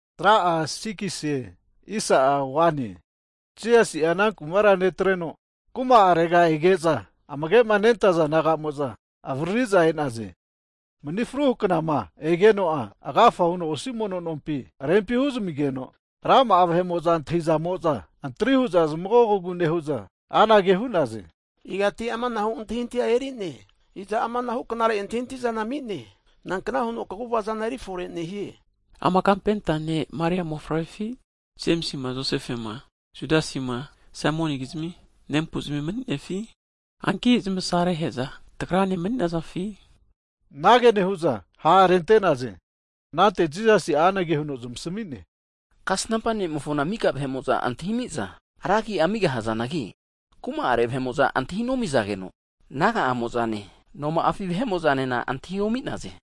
Hagi Jisasi'a ana kumara netreno kuma'arega ege'za, amage'ma nentaza disaipol naga'mo'za avariri'za e'naze. Mani fruhu knama (Sabat) egeno'a agafa huno osi mono nompi rempi huzamigeno, rama'a vahe'mo'za antahizamo'za, antri hu'za zmagogogu nehu'za anage hu'naze, igati amanahu antahintahia erine? Iza amanahu knare antahintahizana ami'ne, nankna huno kagu'vazana eri fore nehie? Ama kapenta ne' Maria mofavrefi? Jemisi'ma Josefema Judasima Saimonikizmi nempu'zimi mani'ne. Hanki asarahe'za tagrane mani'nazafi? Anage nehu'za ha' arente'naze. Anante Jisasi'a anage huno zamasami'ne, Kasnampa ne'mofona mika vahe'mo'za antahi amiza, ra agi'a amigahazanagi, kuma'are vahe'mo'za antahi nomizageno, naga'amo'zane, noma'afi vahe'mo'zanena antahi omi'naze.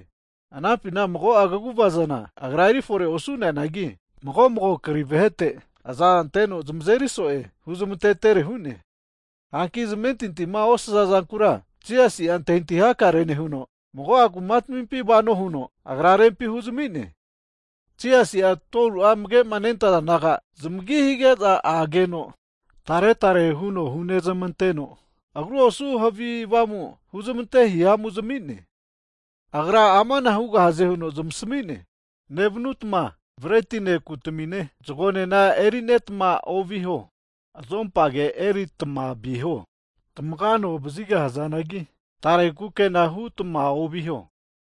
Anampina mago'a kaguvazana Agra eri fore osu'neanagi, mago mago kri vahete azanteno zamazeri so'e huzmantetere hu'ne. Hanki zamentintima osaza'zankura Jisasi'a antahintahi hakare nehuno, mago'a kuma tamimpi vano huno, Agra rempi huzami'ne. Hagi Jisasi'a 12fu'a amage nentaza disaipol naga zamagi hige'za ageno, tare tare huno hunezmanteno, agru osu havi avamu humazmante hihamu zami'ne. Agra amana hugahaze huno zamasami'ne, Nevanutama bretine, kutamine, zagonena erinetama oviho, azompage eritma viho. Tamaga ano vazigahazanagi, tare kukena hutma oviho.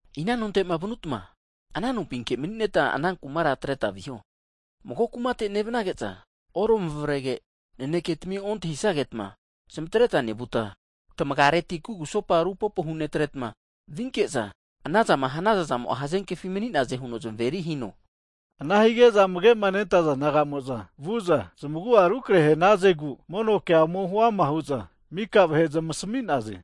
Ina nonte'ma vanutma, ana nompinke maninetma ana kumara atretma viho. Hagi mago kumate nevanage'za oramavrege, naneketimi ontahisagetma zamatreta nevuta, tamagareti kugusopa rupopo hunetretma vinke'za, anazama hanaza zamo'a hazenkefi mani'naze huno zamaveri hino. Ana hige'za amage'ma nentaza disaipol naga'mo'za vu'za, zmagu'a rukrehe hanazegu, mono kea ome huama hu'za mika vahe zmasami'naze.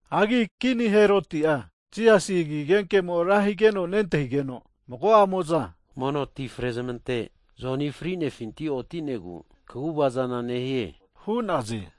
Hagi kini ne' Heroti'a Jisasi agi agenkemo'a ra higeno nentahige'za, mago'amo'za hu'za mono ti frezmante Joni fri'nefinti oti'negu kagu'vazana nehie hu'naze.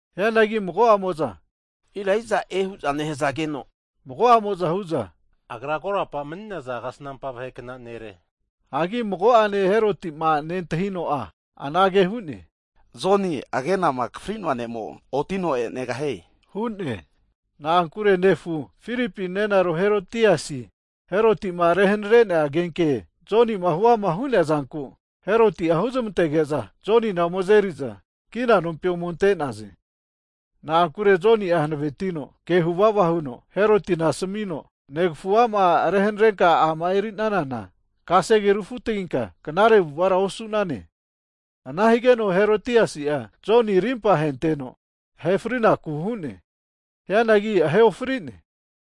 Hianagi mago'amo'za Elaiaj'e hu'za nehazageno, mago'amo'za hu'za, agra korapa mani'naza kasnampa vahekna nere hu'naze. Hagi mago'ane Heroti'ma nentahino'a anage hu'ne, Joni agenama akafrinoa ne'mo otino e'negahie! Hu'ne. Na'ankure nefu, Filipi nenaro Herotiasi, Herotima rehanare'nea agenke Jonima huama hu'neazanku, Heroti'a huzmantege'za Jonina ome azeri'za kina nompi ome ante'naze. Na'ankure Joni'a hanavetino ke huvava huno Herotina asamino, negafu a'ma rehanarenka a'ma erinanana kasege rufutaginka knare avu'avara osu'nane. Ana higeno Herodiasi'a Jonina rimpa ahenteno ahe frinaku hu'ne. Hianagi ahe ofri'ne.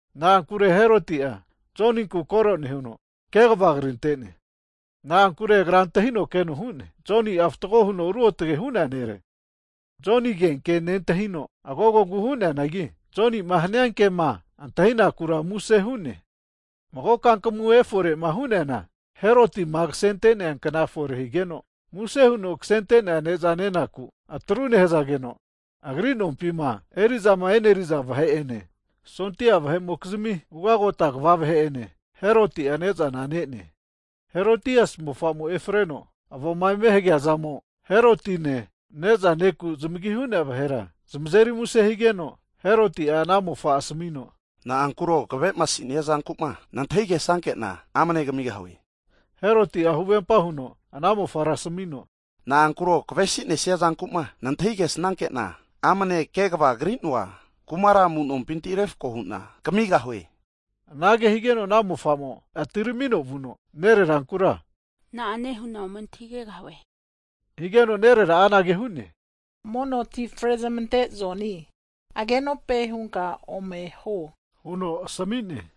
Na'ankure Heroti'a Joninku koro nehuno, kegava krintene. Na'ankure agra antahino keno hu'ne. Joni'a fatgo huno ruotage hu'nea nere. Joni agenke nentahino agogogu hu'neanagi, Jonima hania kema antahinakura muse hu'ne. Mago kankamu eforema hu'neana, Herotima kasente'nea kna fore higeno, muse huno kasente'nea kna'are ne'za nenaku atru nehu'za, agri nompima eri'zama e'neriza vahe'ene, sondia vahe'mokizimi ugagota kva vahe'ene, Heroti'a ne'zana ne'ne. Herodiasi mofamo'a efreno avoa eme nehagegeno, Heroti'ene ne'za neku zamagima hu'nea vahe'mo'za muse hu'naze. Ana hazageno Heroti'a ana kasefa mofara asamino, na'ankuro kave'masinia zanku'ma nantahi kesnanke'na, amane kamigahue hu'ne. Heroti'a huvempa huno ana mofara asamino, na'ankuro kavesinesia zanku'ma nantahi kesnankena amane negamina, kegavama kri'noa kumara amu'nompintira refko hu'na kamigahue. Anage higeno ana mofa'mo atiramino vuno, nererankura na'ane hu'na ome antahigegahue? Higeno nerera'a anage hu'ne, mono ti frezmante Joni agenope hunka ome huo huno asamigeno,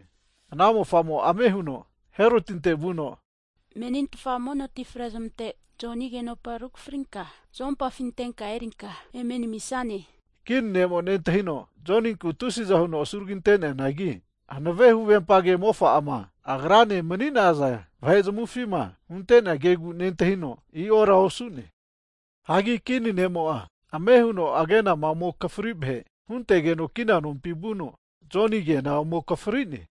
ana mofa'mo'a ame huno Herotinte vuno, menintfa Mono ti frezmante Joni agenopa rukafrinka zuompafi antenka erinka eme namisane huno higeno, Kini ne'mo'a nentahino Joninkura tusiza huno asuragi ante'neanagi, hanave huvempa kema mofa'ama agrane mani'naza vahe zamufi hunte'nea kegu nentahino, i'ora osu'ne. Hagi kini ne'mo'a ame huno agenama ome akafri vahe huntegeno kina nompi vuno, Joni agena ome akafrine.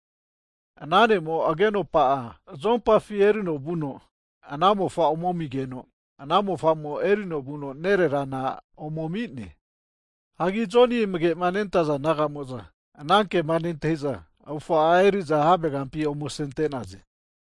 Ana ne'mo'a agenopa'a zoumpafi erino vuno, ana mofa ome ami'geno, ana mofamo erino vuno nererana ome ami'ne. Hagi Joni amage'ma nentaza disaipol naga'mo'za ana kema nentahi'za, avufa'a emeri'za havegampi ome asente'naze.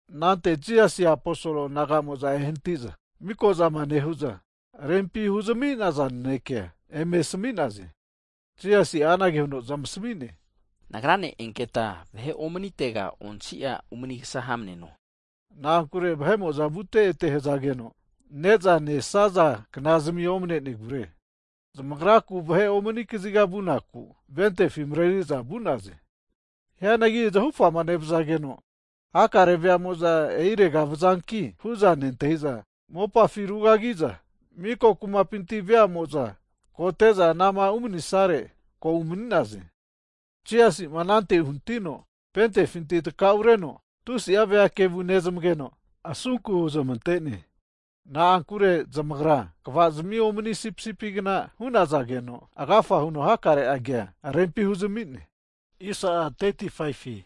Anante Jisasi aposol naga'mo'za, ehanati'za miko'zama nehu'za, vahe'ma rempima hu'zami'naza nanekea eme asami'naze. Jisasi'a anage huno zamasami'ne, Nagrane enketa vahe omanitega onsia umanikasa hamneno, (na'ankure vahe'mo'za vute'ete hazageno, ne'zama nesaza knazimi omanenegure.) Zamagraku vahe omani kaziga vunaku votifi mareri'za vu'naze. Hianagi zahufama nevazageno, hakare veamo'za e'irega vazanki hu'za nentahi'za, mopafi rugagi'za miko kumapinti veamo'za kote'za anama umanisare, ko umani'naze. Hagi Jisasi'ma anante uhanitino votifinti'ma takaureno, tusi'a vea kevu nezamageno'a asunku huzmante'ne. Na'ankure zamagra kvazimi omani sipisipigna hu'nazageno agafa huno hakare kea rempi huzami'ne. Hagi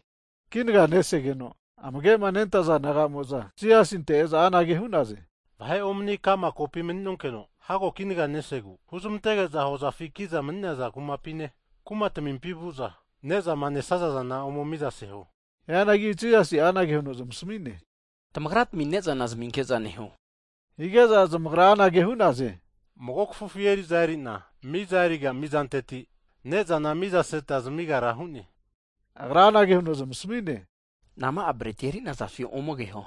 kinaga nesegeno'a amage'ma nentaza disaipol naga'mo'za Jisasinte e'za anage hu'naze, Vahe omani ka'ma kopi mani'nonkeno hago kinaga nesegu, huzmantege'za hozafi kiza mani'naza kumapine, kuma tamimpi vu'za ne'zama nesazazana ome miza seho hu'naze. Hianagi Jisasi'a anage huno zamasami'ne, Tamagratmi ne'zana zaminke'za neho, hige'za zamagra anage hu'naze, 8'a ikampi eri'za erino miza eriga mizanteti ne'zana mizaseta zamigara hu'ne hu'za asami'naze. Agra anage huno zamasami'ne, Nama'a breti eri'nazafi ome keho?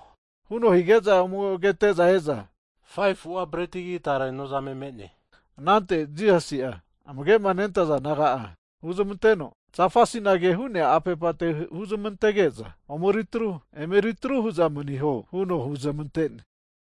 Huno hige'za ome kete'za e'za 5fu'a bretigi, tare nozame me'ne hu'za hu'naze. Anante Jisasi'a amage'ma nentaza disaipol naga'a huzmanteno, zafa asinage hu'nea apepate huzmantenke'za omeri atru, eme eritru hu'za maniho huno huzmante'ne.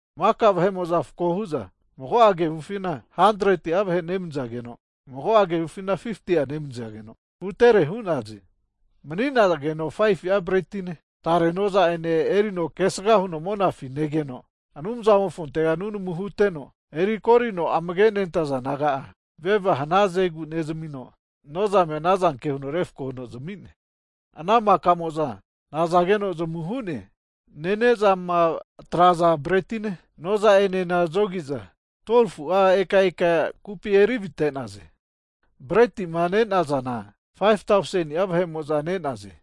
Maka vahe'mo'za refko hu'za mago'a kevufina 100'a vahe nemanizageno, mago'a kevufina 50'a nemanizageno hutere hu'naze. Mani'nageno 5fu'a bretine, tare noza'ene erino kesga huno monafi negeno, Anumzamofontega susu huteno, eri korino amage'ma nentaza disaipol naga'a veva hanazegu nezamino, nozamea anazanke huno refko huno zami'ne. Ana maka'mo'za nazageno zamu hu'ne. Nene'zama atraza bretine, noza enena zogi'za, 12fu'a eka eka kupi eri avite'naze. Bretima ne'nazana 5tauseni'a venenemo'za ne'naze.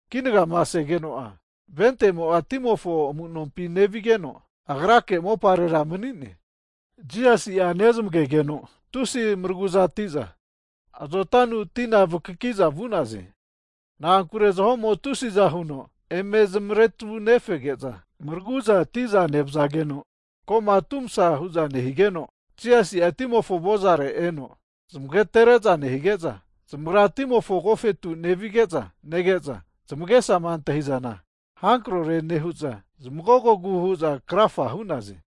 Kinagama segeno'a votimo'a timofo amunompi nevigeno, Agrake moparera mani'ne. Jisasi'a nezmagege'za, tusi maraguzati'za azotanu tina vakakiza vu'naze. Na'ankure zahomo tusiza huno eme zamaretunefege'za, maraguzati'za nevazageno ko'ma atu masa hu'za nehigeno, Jisasi'a timofo avozare eno zamagatere'za nehige'za, zamagrama timofo agofetu nevigeza nege'za, zamagesama antahi'zana hankrore nehu'za zamagogo nehu'za krafa hu'naze.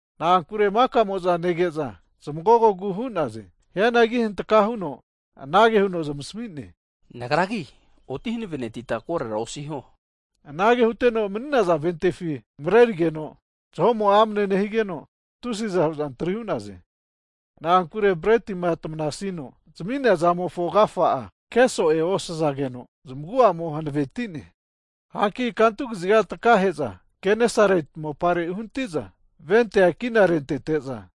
Na'ankure makamo'za nege'za zmagogogu hu'naze. Hianagi hantaka huno anage huno zamasami'ne, Nagragi oti hanavenetita, korora osiho. Anage huteno mani'naza ventefi marerigeno, zaho'mo amane nehige'za tusiza hu'za antri hu'naze. Na'ankure bretima tamanasino zami'nea zamofo agafa'a, ke so'e osazageno zamagu'amo hanavetine. Hanki kantu kaziga takahe'za Genesareti mopare uhanati'za, votia kina rentete'za,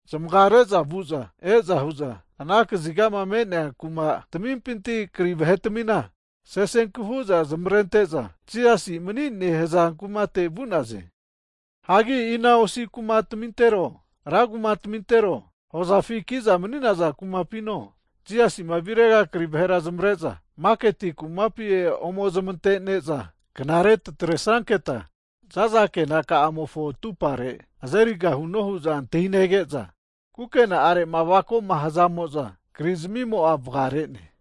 zamaga re'za vu'za e'za hu'za, ana kazigama me'nea maka kumatamimpinti kri vahetamina sesenku hu'za zamavarente'za, Jisasima mani'ne hu'zama hazankumate vu'naze. Hagi ina osi kumatero rankumatero, hozafi ki'za mani'naza kumapino, Jisasi'ma virega kri vahera zamavare'za maketi kumapi ome zmantene'za, Knare zamatresanke'za za'za kena kamofo atupare azerigahuno huza antahinege'za, kukena'arema avakoma hazamokizmia kri zamimo'a vagare'ne.